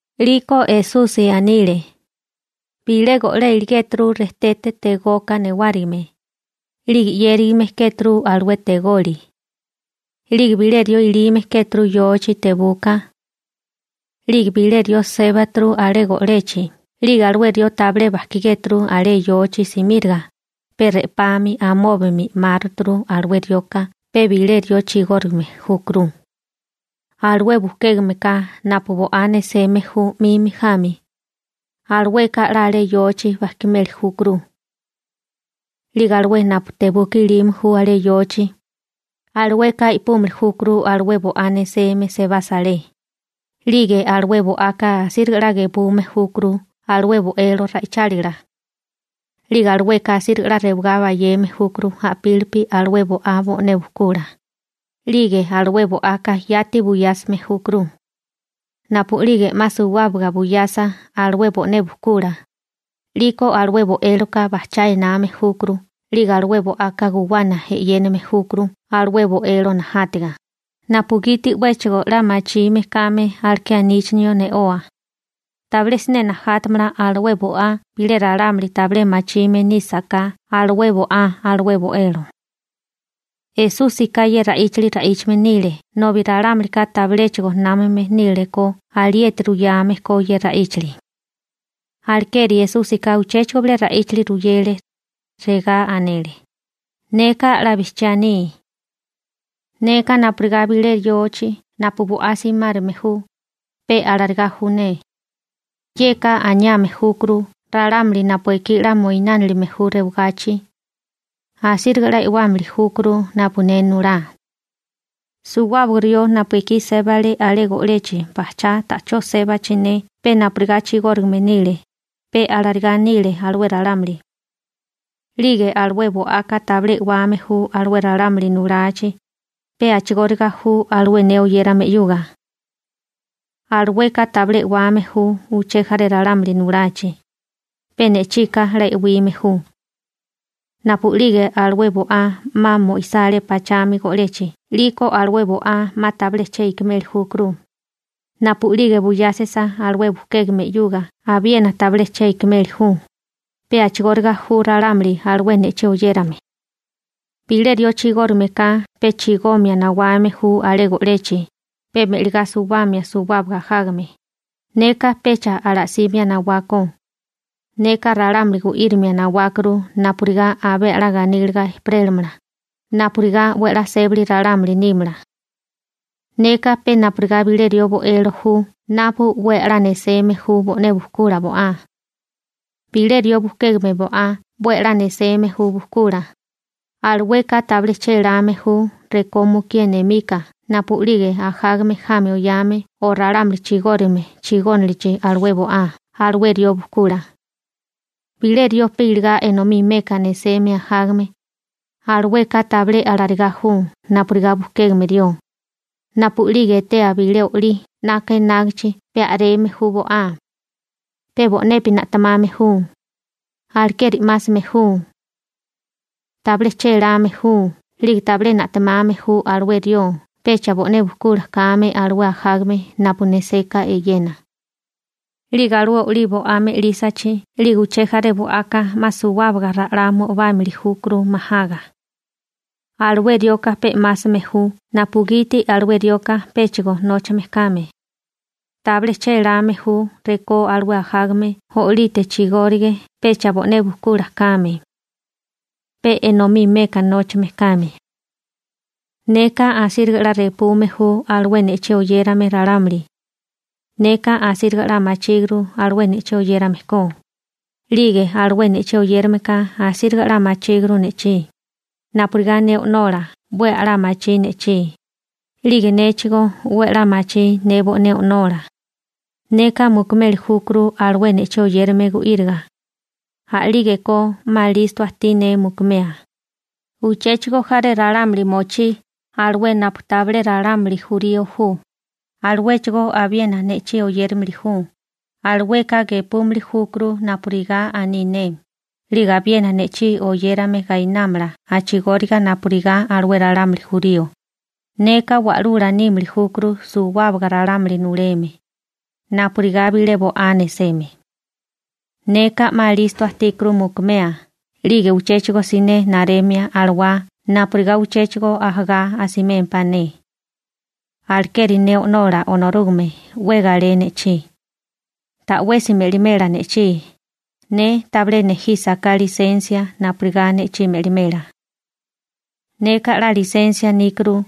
'Liko Esusi anile: ―Bilé go'lé iligéturu rejtete tegoka newárigime, 'lige 'yérigame kéturu alué tegoli. 'Lige bilé rió ilime kéturu yochi tebuka. 'Lige bilé rió sébaturu alé go'lechi 'lige alué rió tabilé bajkigéturu alé yochi simíriga, pe re'pami amóbami 'máraturu, alué rioka pe bilé rió chigórigame júkuru. Alué bujkégame ka napu bo'á neseme ju 'mimi jami, alueka 'la alé yochi bajkimeli júkuru. 'Lige alué napu tebuka ilime ju alé yochi, alueka i'púmili júkuru alué bo'á neseme sebasa alé. 'Lige alué bo'aka asíriga 'la gepume júkuru alué bo'elo ra'ichálila. 'Lige alueka asíriga 'la rewagá bayeme júkuru a'pílipi alué bo'á bo'né bujkula, 'lige alué bo'aka yati buyásime júkuru. Napu'lige 'ma suwábaga buyasa alué bo'né bujkula, 'liko alué bo'éloka bajchá ename júkuru 'lige alué bo'aka guwana e'yéname júkuru alué bo'elo najátiga, napugiti 'wéchigo 'la machime kame aleké aníchinio ne'oa. Tabilé siné najátamala alué bo'á bilé ralámuli tabilé machime nísaká alué bo'á alué bo'elo. Esúsika ye ra'íchali ra'íchame nile nobi ralámulika tabiléchigo námame nílekó alieti ruyame ko ye ra'íchali. Alekeri Esúsika uchéchigo bilé ra'íchali ruyele. Regá anele: ―Neka 'la bijchiá aní. Neka napurigá bilé yochi napu bo'á simárame ju, pe alarigá ju ne. Yeka aniame júkuru ralámuli napu ekí 'la moinánilime ju rewagachi, asíriga 'la e'wámili júkuru napu ne nulá. Suwábaga rió napu ekí sébale alé go'lechi bajchá ta'chó sébachi ne pe napurigá chigórigame nile, pe alarigá nile alué ralámuli. 'Lige alué bo'aka tabilé e'wame ju alué ralámuli nulachi. Pe a'chigóriga ju alué ne oyérame 'yuga. Alueka tabilé e'wame ju uché jaré ralámuli nulachi, pe ne'chika 'la e'wime ju. Napu'lige alué bo'á 'ma mo'isá alé pachami go'lechi 'liko alué bo'á 'ma tabilé che ikimeli júkuru. Napu'lige buyásisa alué bujkégame 'yuga abiena tabilé che ikimeli ju. Pe a'chigóriga ju ralámuli alué ne'chí oyérame. › Bilé rió chigórigame ka pe chigomia nawame ju alé go'lechi, pe me'ligá suwábimia suwábaga ajágame. Neka pecha ala'símia nawákó. Neka ralámuli gu'írimia nawákuru napurigá abé 'la ganíliga ejperélamala, napurigá 'we a'lá sébali ralámuli nímala. Neka pe napurigá bilé rió bo'elo ju napu 'we a'lá nesérame ju bo'né bujkula bo'á. Bilé rió bujkégame bo'á 'we a'lá neseme ju bujkula, alueka tabilé chéláme ju rekó mukié nemika napu'lige ajágame jami oyame o ralámuli chigórigame chigónilichi alué bo'á alué rió bujkula. Bilé rió pe iligá enomí meka neseme ajágame, alueka tabilé alarigá ju napurigá bukégame rió, napu'lige etea bilé olí (lobo) 'naka enágichi pe a'reme ju bo'á. Pe bo'nepi na'temame ju, alekeri 'másame ju. Tabilé chéláme ju 'lige tabilé na'temame ju alué rió pecha bo'né bujkula kame alué ajágame napu neseka eyena. 'Lige alué olí bo'á me'lísachi 'lige uché jaré bo'aka 'ma suwábaga ra'lá mo'ibámili júkuru majaga. Alué rioka pe 'másame ju napugiti alué rioka péchigo nóchame kame, tabilé chéláme ju rekó alué ajágame o'lite chigórige pecha bo'né bujkula kame. Pe enomí meka nóchame kame. › Neka asíriga 'la repume ju alué ne'chí oyérame ralámuli. Neka asíriga 'la machíguru alué ne'chí oyérame ko, 'lige alué ne'chí oyérameka asíriga 'la machíguru ne'chí, napurigá ne O'nola 'we a'lá machí ne'chí, 'lige néchigó 'we a'lá machí ne bo'né O'nola. Neka mukumeli júkuru alué ne'chí oyérame gu'íriga, a'lígeko 'ma listo ajtí ne mukumea. Uchéchigo jaré ralámuli mochí, alué napu tabilé ralámuli jurío ju. Aluéchigó abiena ne'chí oyéramili ju, alueka gepúmili júkuru napurigá aní ne, 'lige abiena ne'chí oyérame gainámala a'chigóriga napurigá alué ralámuli jurío. Neka Wa'lula nímili júkuru suwábaga ralámuli nuleme, napurigá bilé bo'á neseme. › Neka 'ma listo ajtíkuru mukumea 'lige uchéchigo siné naremia alawá napurigá uchéchigo ajagá asimémpá ne. Alekeri ne O'nola Onorúgame 'we galé ne'chí. Ta'wesi me'limela ne'chí, ne tabilé nejísaká lisensia napurigá ne'chí me'limela. Neka 'la lisensia níkuru,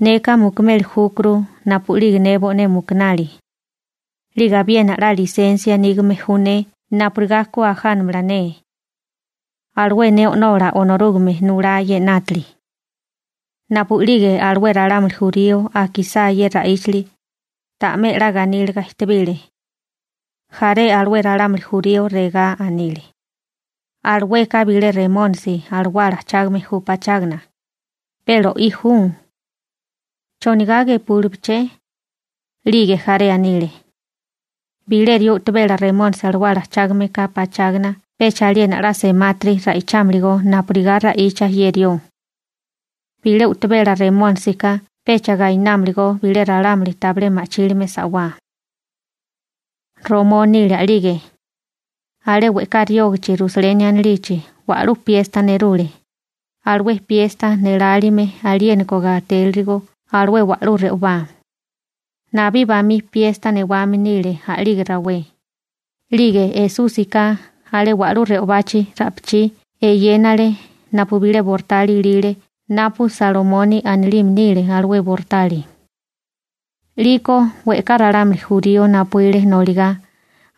neka mukumeli júkuru napu'lige ne bo'né mukunali, 'lige abiena 'la lisensia nígame ju ne napurigá ku ajánamala ne. Alué ne O'nola Onorúgame nulá ye 'nátili. Napu'lige alué ralámuli jurío akisá ye ra'íchali, ta'mé 'la ganíliga ejtebile. Jaré alué ralámuli jurío regá anile: ―Alueka bilé remónisi alawala ajchágame ju pachágana, pe lo'í ju. ¿Chonigá gepúlibeché? 'Lige jaré anile: ―Bilé rió u'tabela remónisi alawala ajchágame nísaká pachágana pecha aliena 'la semátiri ra'ichámilikó napurigá ra'icha ye rió. Bilé u'tabela remónisika pecha gainámalagó bilé ralámuli tabilé ma'chílime sa'wá. Romó nile a'lige. Alé we'ká riógichi Rusaleni anilichi wa'lú piesta nerule, alué piesta nélálime aliéniko gatélirigo alué wa'lú re'obá, nabí bamí piesta newame nile a'lige rawé. 'Lige Esúsika alé wa'lú re'obachi ra'pichí eyénale napu bilé bortali ilile napu Salomoni anilime nile alué bortali. 'Liko we'ká ralámuli jurío napuíle noligá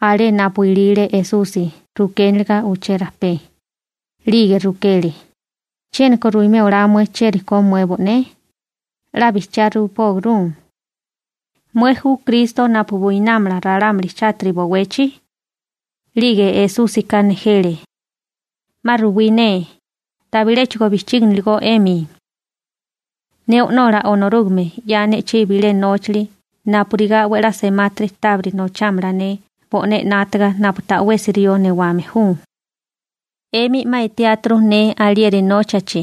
alé napu ilile Esusi rukéniliga uché rajpé. 'Lige rukele: ―¿Chiéniko ruimé olá mué chieri ko mué bo'né? 'La bijchiá ruipóguru, ¿mué ju Kristo napu buinámala ralámuli chátiri bowechi? 'Lige Esúsika nejele: ―'Ma ruwí ne, tabiléchigo bijchíginiligó 'emi. Ne O'nola Onorúgame 'ya ne'chí bilé nóchali napurigá 'we a'lá semátiri tábiri nochámala ne bo'né 'nátaga napu ta'wesi rió newame ju. 'Emi 'ma etiáturu ne alieri nóchachi,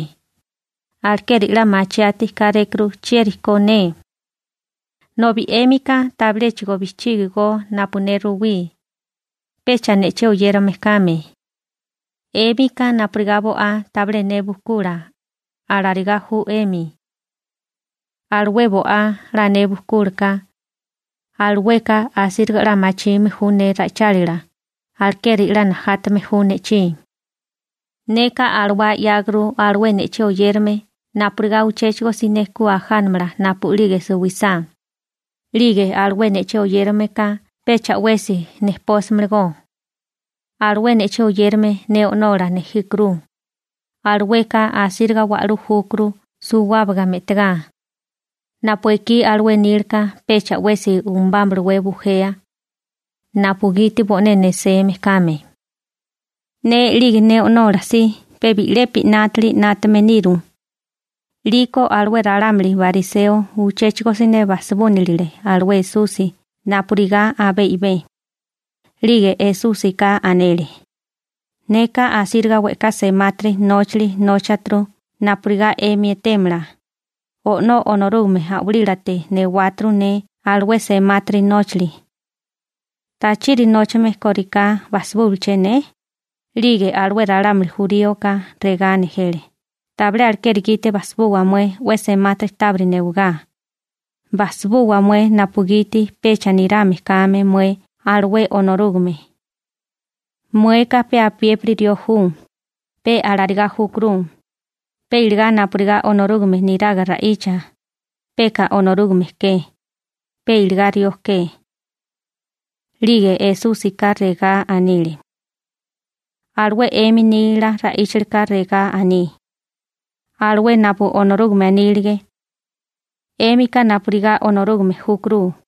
alekeri 'la machiati kárékuru chieri ko ne. Nobi 'émika tabilé bijchígigo napu ne ruwí, pecha ne'chí oyérame kame. 'Émika napurigá bo'á tabilé ne bujkula, alarigá ju 'emi. Alué bo'á 'la ne bujkúlaka, alueka asíriga 'la machime ju ne ra'ichálila, alekeri 'la najátame ju ne'chí. Neka alawá 'yáguru alué ne'chí oyérame napurigá uchéchigo siné ku ajánamala napu'lige suwisá, 'lige alué ne'chí oyérame ka pecha 'wesi nejpósimalagó. Alué ne'chí oyérame ne O'nola nejíkuru. Alueka asíriga wa'lú júkuru suwábaga me'tigá, napu ekí alué nílaka pecha 'wesi umabámalawé bujea, napugiti bo'né neseme kame. Ne 'lige ne O'nola si pe bi'lepi 'nátili 'nátame niru. 'Liko alué ralámuli bariseo uchéchigo siné bajsibúnilile alué Esusi napurigá abé i'bé. 'Lige Esúsika anele: ―Neka asíriga we'ká semátiri nóchali nóchaturu napurigá 'emi etémala, O'nó Onorúgame a'walílate newáturu ne alué semátiri nóchali. ¿Tachiri nóchame korigá bajsibúwaché ne? 'Lige alué ralámuli juríoka regá nejele: ―Tabilé alekeri gite bajsibuwa mué 'we semátiri tábiri newigáriká. Bajsibuwa mué napugiti pecha nirame kame mué alué Onorúgame. Mueka pe apiépiri rió ju, pe alarigá júkuru, pe iligá napurigá Onorúgame neraga ra'icha mué, peka Onorúgame ke, pe iligá rió ke. 'Lige Esúsika regá anile: ―Alué 'emi nila ra'íchalika regá aní, alué napu Onorúgame anílige: «'Émika napurigá Onorúgame júkuru.»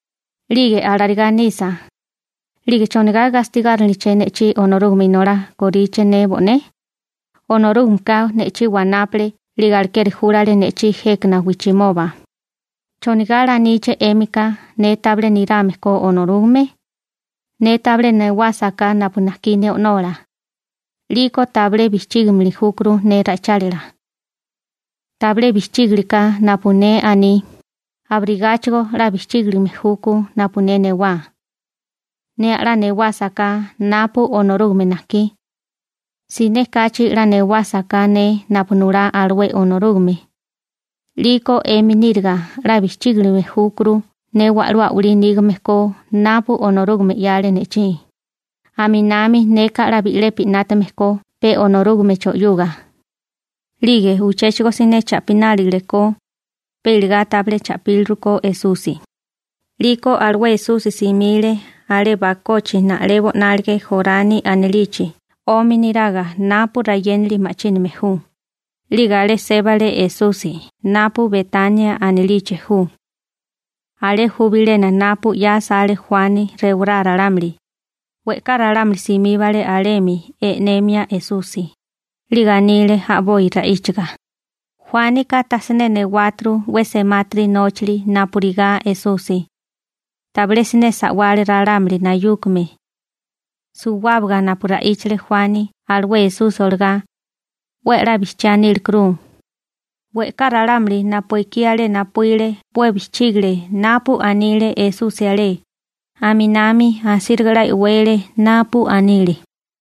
'Lige alarigá nisa, 'lige ¿chonigá gastigáriniliché ne'chí Onorúgame Inolá korichi ne bo'né? Onorúgameka ne'chí wanápale 'lige alekeri júlale ne'chí jékana wijchimoba. ¿Chonigá laníché 'émika ne tabilé nirame ko Onorúgame? Ne tabilé sébali olásaká napu najkí ne O'nola, 'liko tabilé bijchígilime júkuru ne ra'ichálila. Tabilé bijchígiliká napu ne aní, abirigáchigo 'la bijchígilime júkó napu ne sébali olá napu Onorúgame najkí. Siné kachi 'la e'wame nísaká ne napu nulá alué Onorúgame, 'liko 'emi níriga 'la bijchígilime júkuru ne wa'lú a'walí nígame ko napu Onorúgame 'yale ne'chí. Aminami neka 'we a'lá 'nátaga eyéname ju Onorúgame na'tálila. 'Lige uchéchigo siné cha'pinálile, pe iligá tabilé cha'píliru Esusi. 'Liko alué Esusi simile alé bakochi na'lebo 'nálige Jorani anilichi 'omi niraga napu rayénali ma'chíname ju, 'lige alé sébale Esusi (napu Betánea anilichi ju). Alé ju bilena napu 'ya asale Juani rewará ralámuli. We'ká ralámuli simíbale alemi e'nemia Esusi, 'lige anile a'boi ra'íchaga: ―Juánika tajsiné newáturu 'we semátiri nóchali napurigá Esusi, tabilé siné sa'wale ralámuli nayúkame. Suwábaga napu ra'íchale Juani alué Esusi olagá, 'we a'lá bijchiá nílekuru. We'ká ralámuli napu ekí alé napuíle 'we bijchígale napu anile Esusi alé, aminami asíriga 'la e'wele napu anile.